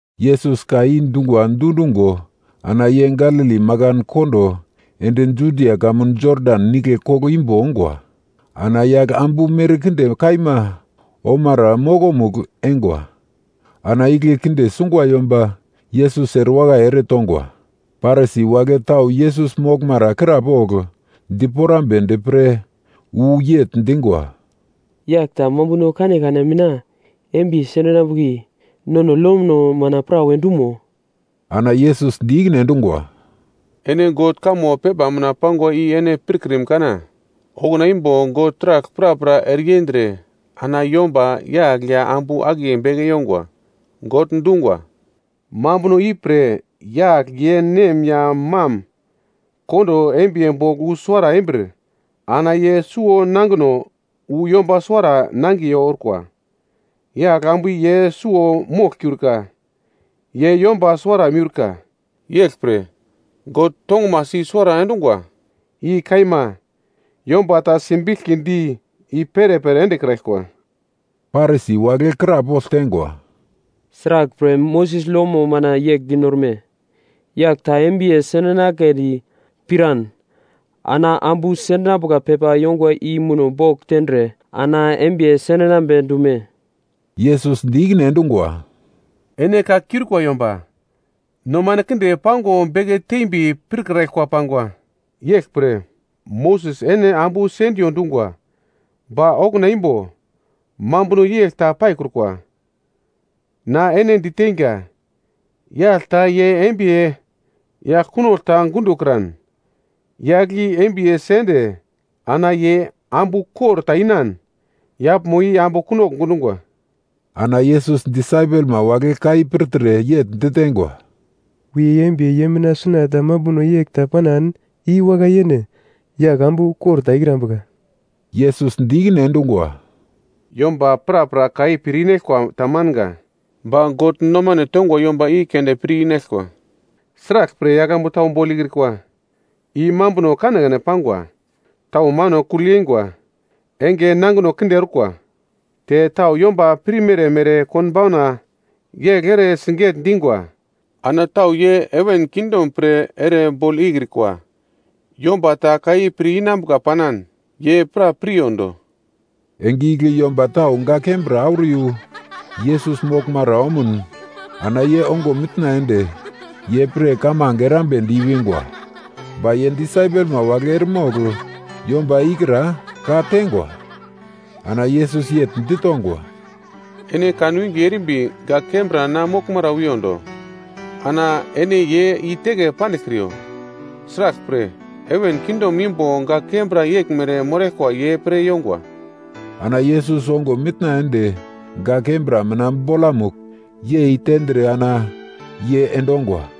Yesus ka i dungwa dundungo ana ye Galili makan kondo ende Judia kamun Jodan Nigle koglo imbo ongwa. Ana yagl ambu merkinde kaima omara mokomugl eingwa. Ana igle kinde sungwa yomba Yesus erewakai eretongwa. Parisi wagle tau Yesus moglmara krapogl diporamnedi pre wu yegl dingwa, “Yagl ta mambuno kanekane mina embiye sendinambuka nono lono mina prawe dumo?” Ana Yesus di ikine endungwa, “Ene God kamo pepa mina pangwa i ene pirkrim kana? Okuna imbo God taragl prapra ereyendre ana yomba yagl ya ambu akiye beke yongwa. God dungwa, ‘Mambuno ipre yagl ye nem ya mam kondo embiye bogl wu suwara embir ana ye suwo nangino wu yomba suwara nangiye orkwa.’ Yagl ambu i ye suwo moglkiurka, ye yomba suwara miurka. Yeglpre taragl God tongumasi i-suwara endungwa. I kaima yomba ta simbiglkidi i perepere endekraglkwa.” Parisi wagle krapogl teingwa, “Sraglpre Moses lomo mina yegl dinorme, ‘Yagl ta embiye sendinagledi piran ana ambu sendingwa pepa yongwa i muno bogl tendre ana embiye sendinambe dume?’” Yesus di ikine endungwa, “Ene ka kiurikwa yomba, nomano kinde pango beke tembi pirkraglkwa pangwa. Yeglpre Moses ene ambu sendiyo dungwa. Ba okuna imbo mambuno yegl ta paikrukwa. Na ene diteinga, yagl ta ye embiye yagl kunogl ta gundokran, yagl i embiye sende ana ye ambu kor ta inan, yaglmo i ambu kunogl gundungwa.” Ana Yesus disaipelma wagle ka i pirtre yegl diteingwa, “Wiye embiye ye mina suna mambuno yegl ta panan i wakai yene, yagl ambu kor ta ikrambuka.” Yesus di ikine endungwa, “Yomba prapra ka i pir inaglkwa tamanga. Ba God nomane tongwa yomba i keunde pir inaglkwa. Sraglpre yagl ambu tau bogl ikrikwa? I mambuno kanekane pangwa. Tau mano kugl yeingwa enge nangino kinde orkwa te tau yomba pirmere mere konbauna yegl ere siget-dingwa. Ana tau ye heven kingdom pre ere bogl ikrikwa. Yomba ta ka i pir inambuka panan, ye pra piryondo.” Enge igle yomba tau gak kembra auro yu Yesus moglmara omuno ana ye ongo mitna ende ye pre kamange erambedi i-wingwa. Ba ye disaipelma wagle eremogl yomba ikra ka-tengwa. Ana Yesus yegl ditongwa, “Ene kan winge erimbi gak kembra na moglmara wiyondo, ana ene ye i-teke pandiglkriyo. Sraglpre, heven kingdom imbo gak kembra yeglmere moraglkwa ye pre yongwa.” Ana Yesus ongo mitna ende gak kembra mina bolamugl yei tendre ana ye endongwa.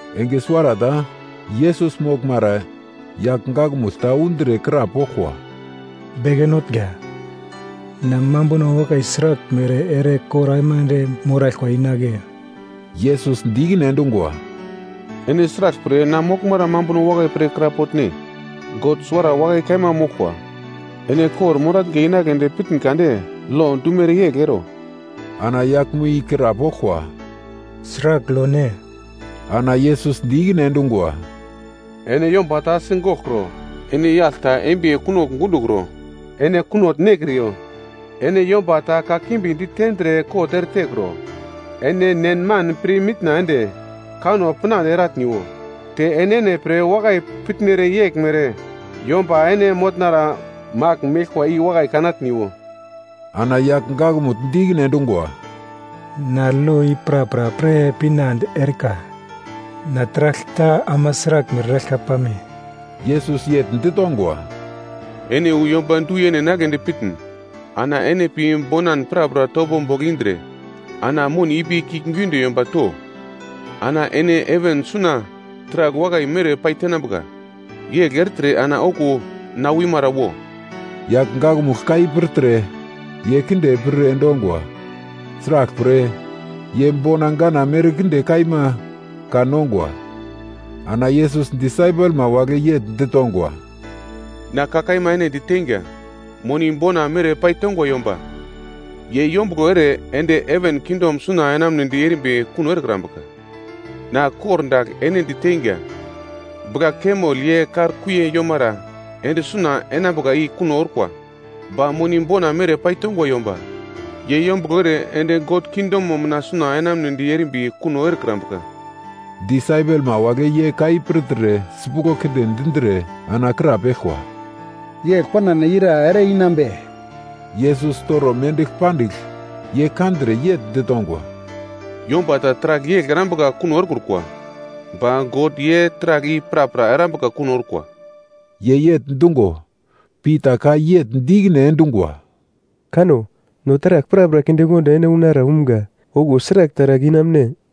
Enge suwarata Yesus moglmara yagl gakmugl ta undre krapoglkwa, “Beke notnga, na mambuno wakai sraglmere ere kor aimande moraglkwa inagle?” Yesus di ikine endungwa, “Ene sraglpre na moglmara mambuno wakai pre krapotne? God suwara wakai kaima moglkwa. Ene kor-moratnga inagledi pitn kade lo dumere yegl ero.” Ana yaglmo i krapoglkwa, “Sragl lo ne?” Ana Yesus di ikine endungwa, “Ene yomba ta sigoglkro, ene yagl ta embiye kunogl gundokro, ene kunogl goglkro, ene yomba ta kakimbi ditendre kot eretekro. Ene nen man pirmitna ende kanno pinande eratniwo. Te enene pre wakai pitnere yeglmere yomba ene motnara magl meglkwa i wakai kanatniwo.” Ana yagl gakmugl di ikine endungwa, “Na lo i prapra pir pinande erikwa. Na taragl ta ama sraglmere eraglka pame?” Yesus yegl ditongwa, “Ene wu yomba du-yene enagledi pitn, ana ene pi bonan prapra topo bogl indre, ana moni ipi kiuglgiunde yomba to. Ana ene heven suna taragl wakai mere paitenambuka, yegl ertre ana okuwo na wimara wo.” Yagl gakmugl ka i pirtre ye kinde pir endongwa. Sraglpre, ye bona gana merkinde kaima kan-nongwa. Ana Yesus disaipelma wagle yegl ditongwa, “Na ka kaima ene diteinga, moni bona mere paitongwa yomba ye yombuglo ere ende heven kingdom suna enamunedi erimbi kuno erekrambuka. Na kordagl ene diteingwa, bugla-kamel ye kar kuiye yomara ende suna enambuka i kuno orkwa. Ba moni bona mere paitongwa yomba ye yombuglo ere ende God kingdomo mina suna enamunedi erimbi kuno erekrambuka.” Disaipelma wagle ye ka i pirtre sipuglo kinde dindre ana krapeglkwa, “Yegl panan ira ere-inambe?” Yesus toro mendigl pandigl ye kandre yegl ditongwa, “Yomba ta taragl yegl erambuka kuno erekrukwa. Ba God ye taragl i prapra erambuka kuno orkwa.” Ye yegl dungo, Pita ka yegl di ikine endungwa, “Kanno! No taragl prapra kindekondo ene unara umgra. Okuwo sragl taragl inamune?”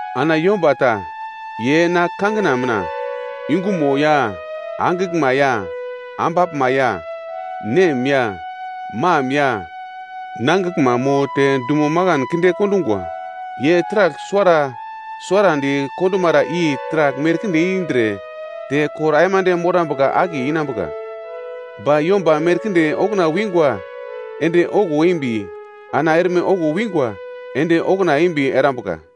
Ana yomba ta ye na kangina mina yungumo ya angiglma ya ambaglma ya nem ya mam ya nangiglma mo te dumo makanmo kinde kondungwa, ye taragl suwara suwarandi kondumara i taragl merkinde indre, te kor aimande morambuka akiye inambuka. Ba yomba merkinde okuna wingwa ende okuwo embi, ana erme okuwo wingwa ende okuna embi erambuka.